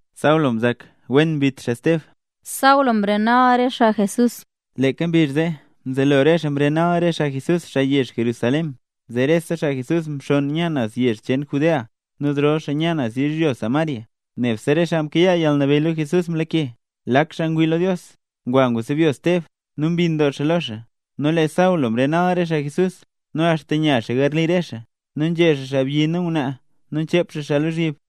Saulo mzak wen mbit xaa Steb. Saulo mrenal re xaa Jesús Leeka mbizh zee mzelo re xaa mrenal re xaa Jesús, xaa yezh Jerusalén, zee rese xaa Jesús mxonn nya naz re yezh cheen Judea nu zrol xaa nya naz yizhyo Samaria, nebse re xaa mkayaa yalnabeyy lo Jesús mlake. Lak xaa ngwii lo Dios, ngwa sebyo Steb nu mbinn doo xaa lo xaa. Nu lee Saulo mrenal re xaa Jesús, nu axta nya xaa garli re xaa, nu nzhe xaa xaabyi nu ngwnaa nu nchep xaa xaa lozhyib.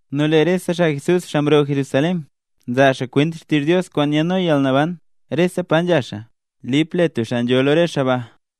Nu lee rese xaa Jesús, xaa mroo Jerusalén, nzaa xaa kwent xtizh Dios kwaan nyaadno yalnaban, rese pa nzha xaa. Lip le tub xaa nzho lo re xaa ba,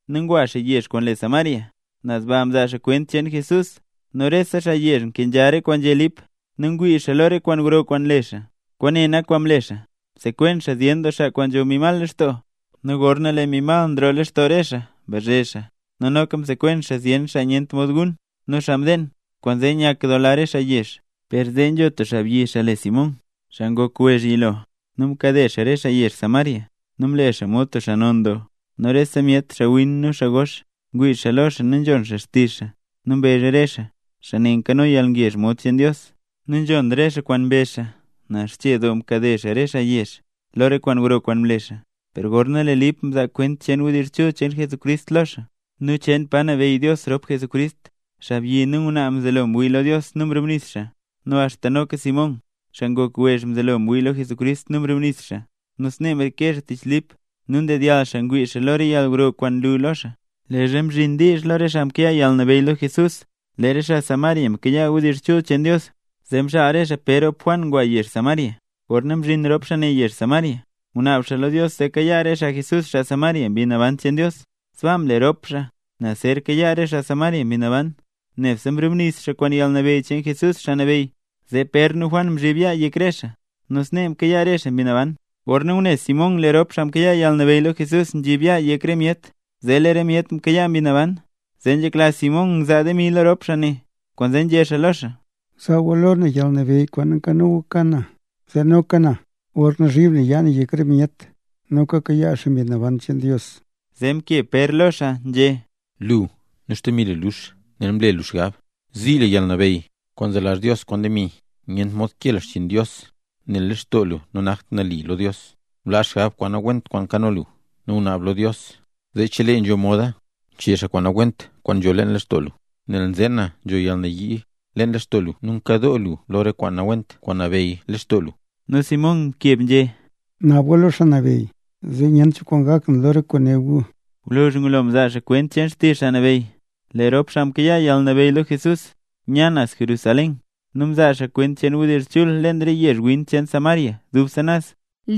nu ngwa xaa yezh kwaan le Samaria. Naz baa mzaa xaa kwent cheen Jesús. Nu rese xaa yezh nkenzha re kwaan nzhé Lip, nu ngwii xaa lo re kwaan gro kwaan nle xaa. Kwaane nak kwaan mle xaa: msekwen xaa zyen doo xaa kwaan nzho mbi mal lextoo, nu gorna lee mbi mal nroo lextoo re xaa mbazhe xaa, nu noka msekwen xaa zyen xaa nyent mod gun nu xaa mdeen, kwaanzee nyakdoola re xaa yezh. Per zee nzho tub xaabyi, xaa le Simón, xaa ngok wezh yilo nu mkade xaa re xaa yezh Samaria, nu mle xaa mod tub xaa non doo. Nu rese myet, xaawin nu xaa gox, ngwii lo xaa nu nzhon xaa xtizh xaa, nu mbezh re xaa: —Xaa ne nkano yalnabeyy mod cheen Dios. Nu nzhon re xaa kwaan mbezh xaa, nel xche doo mkade xaa re xaa yezh lo re kwaan gro kwaan mle xaa. Per gorna lee Lip nzaa kwent cheen wdizh chul cheen Jesucrist lo xaa, nu cheen pa nabeyy Dios rop Jesucrist, xaabyi nu ngwnaa mzelo ngwii lo Dios nu mrubnis xaa. Nu axta noka Simón, xaa ngok wezh mzelo ngwii lo Jesús nu mrubnis xaa, nu snee mreke xaa tich Lip, nu ndedyall xaa ngwii xaa lo re yalgro kwaan nlu lo xaa. Leezha mzhin diizh lo re xaa mkayaa yalnabeyy lo Jesús lee re xaa Samaria mkayaa wdizh chul cheen Dios, zee mxaal re xaa Pér rop Juan ngwa yezh Samaria. Gorna mzhin rop xaa ne yezh Samaria, ngunaab xaa lo Dios zee kayaa re xaa Jesús, xaa Samaria, Mbi Naban cheen Dios. Sbaa mle rop xaa ne nel zer kayaa re xaa Samaria Mbi Naban; nebse mrubnis xaa kwaan yalnabeyy cheen Jesús, Xaa Nabeyy. Zee Pér nu Juan mzhib yaa yek re xaa, nu snee mkayaa re xaa Mbi Naban. Gorna ngune Simón lee rop xaa mkayaa yalnabeyy lo Jesús nzhib xaa yaa yek re myet, zee lee re myet mkayaa Mbi Naban, zee nzhekla Simón ngzaa demi lo rop xaa ne, kwaanzee nzhé xaa lo xaa: —Zaa gu lo na yalnabeyy kwaan nkano gu ka na, zee noka na gorna zhib na yaa na yek re myet, noka kayaa xaa Mbi Naban cheen Dios. Zee mkeb Pér lo xaa nzhé: —¡Lu, nu xdemi lu lux, nel mle lu xgab zii lu yalnabeyy kwaan nzelazh Dios kwaan demi! Nyent mod kee lu xchiin Dios, nel lee lextoo lu nanakt nali lo Dios. Blaa xgab nawent kwaan nkano lu, nu bnaab lo Dios zee chelee nzho moda, chee xaa kwaan nawent kwaan nzho leen lextoo lu, nel nzeen na nzho yalnayii lextoo lu nu nkadoo lu lo re kwaan nawent kwaan nabeyy lextoo lu. Nu Simón mkeb nzhé: —Naab gu lo Xaa Nabeyy, zee nyent cho kwaan gak na lo re kwaan né gu. Gwluzh ngulo mzaa xaa kwent cheen xtizh Xaa Nabeyy, lee rop xaa mkayaa yalnabeyy lo Jesús, nya naz Jerusalén nu mzaa xaa kwent cheen wdizh chul leen re yezh win cheen Samaria dubse naz.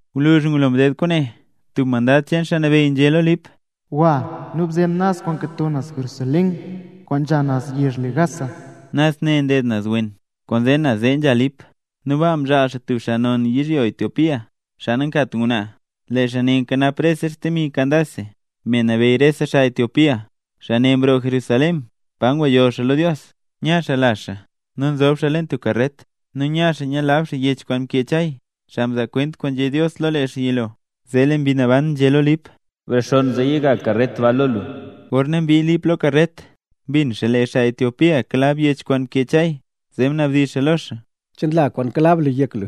Gwluzh ngulo mded kwaane tub mandad cheen Xaa Nabeyy nzhé lo Lip: —Gwa nu bzen naz kwaan nkato naz Jerusalén kwaan nzha naz yezh le Gaza —naz ne nded naz wen. Kwaanzee naz zee nzha Lip. Nu baa mzhaal xaa tub xaa non yizhyo Etiopía, xaa nankat ngwnaa. Lee xaa ne nkanap rese xdemi Candace, me nabeyy rese xaa Etiopía. Xaa ne mroo Jerusalén pa nguyoll xaa lo Dios. Nya xaa lazh xaa nu nzob xaa leen tub karret, nu nya xaa nyilab xaa yech kwaan mkee Chay, xaa mzaa kwent kwaan nzhé Dios lo lee xaa yilo. Zee lee Mbi Naban nzhé lo Lip: —Brexonn zee yiga karret ba lo lu. Gorna mbii Lip lo karret, mbin xaa lee xaa Etiopía kalab yech kwaan mkee Chay, zee mnabdizh xaa lo xaa: —¿Che nla kwaan kalab lu yek lu?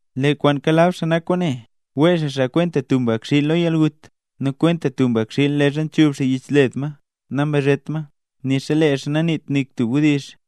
Lee kwaan kalab xaa nak kwaane: Wee xaa xaa kwenta tub mbakxiil lo yalgut, nu kwenta tub mbakxiil leezha nchub xaa yich led ma nambazhet ma, nixa lee xaa naniit nik tub wdizh.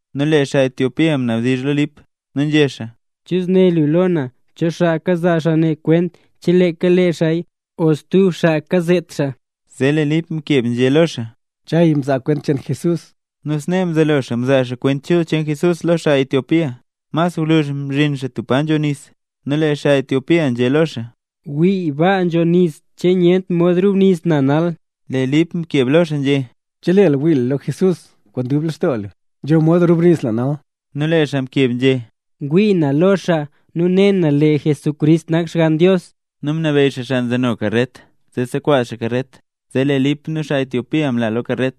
Nu lee xaa Etiopía mnabdizh lo Lip, nu nzhé xaa: —¿Chu zné lu lo na? ¿Cho xaa nzaa xaa ne kwent, che leeka lee xaaya o stub xaa kazet xaa? Zee lee Lip mkeb nzhé lo xaa: —Chay mzaa kwent cheen Jesús. Nu snee mzelo xaa mzaa xaa Kwent Chul cheen Jesús lo xaa Etiopía. Mas gwluzh mzhin xaa tub pa nzho nis nu lee xaa Etiopía nzhé lo xaa: —¡Wii, baa nzho nis! ¿Che nyent mod rubnis na nal? Lee Lip mkeb lo xaa nzhé: —Chelee lu wii lu lo Jesús kwaan dub lextoo lu, nzho mod rubnis lu nal. Nu lee xaa mkeb nzhé: —Ngwii na lo xaa, nu ne na lee Jesucrist nak Xgann Dios. Nu mnabeyy xaa xaa nzeno karret zee sekwaz xaa karret, zee lee Lip nu xaa Etiopía mla lo karret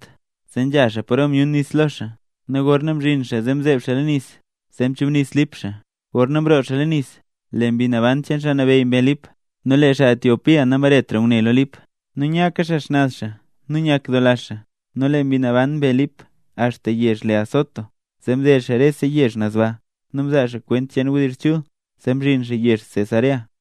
zee nzha xaa paro myun nis lo xaa, nu gorna mzhin xaa mzeeb xaa leen nis, zee mchubnis Lip xaa. Gorna mroo xaa leen nis, lee Mbi Naban cheen Xaa Nabeyy mbe Lip. Nu lee xaa Etiopía nambaretra ngune lo Lip. Nu nyaka xaa xnaz xaa nu nyakdoola xaa. Nu lee Mbi Naban mbe Lip axta yezh le Azoto. Zee mded xaa rese yezh naz baa, nu mzaa xaa kwent cheen wdizh chul, zee mzhin xaa yezh Cesarea.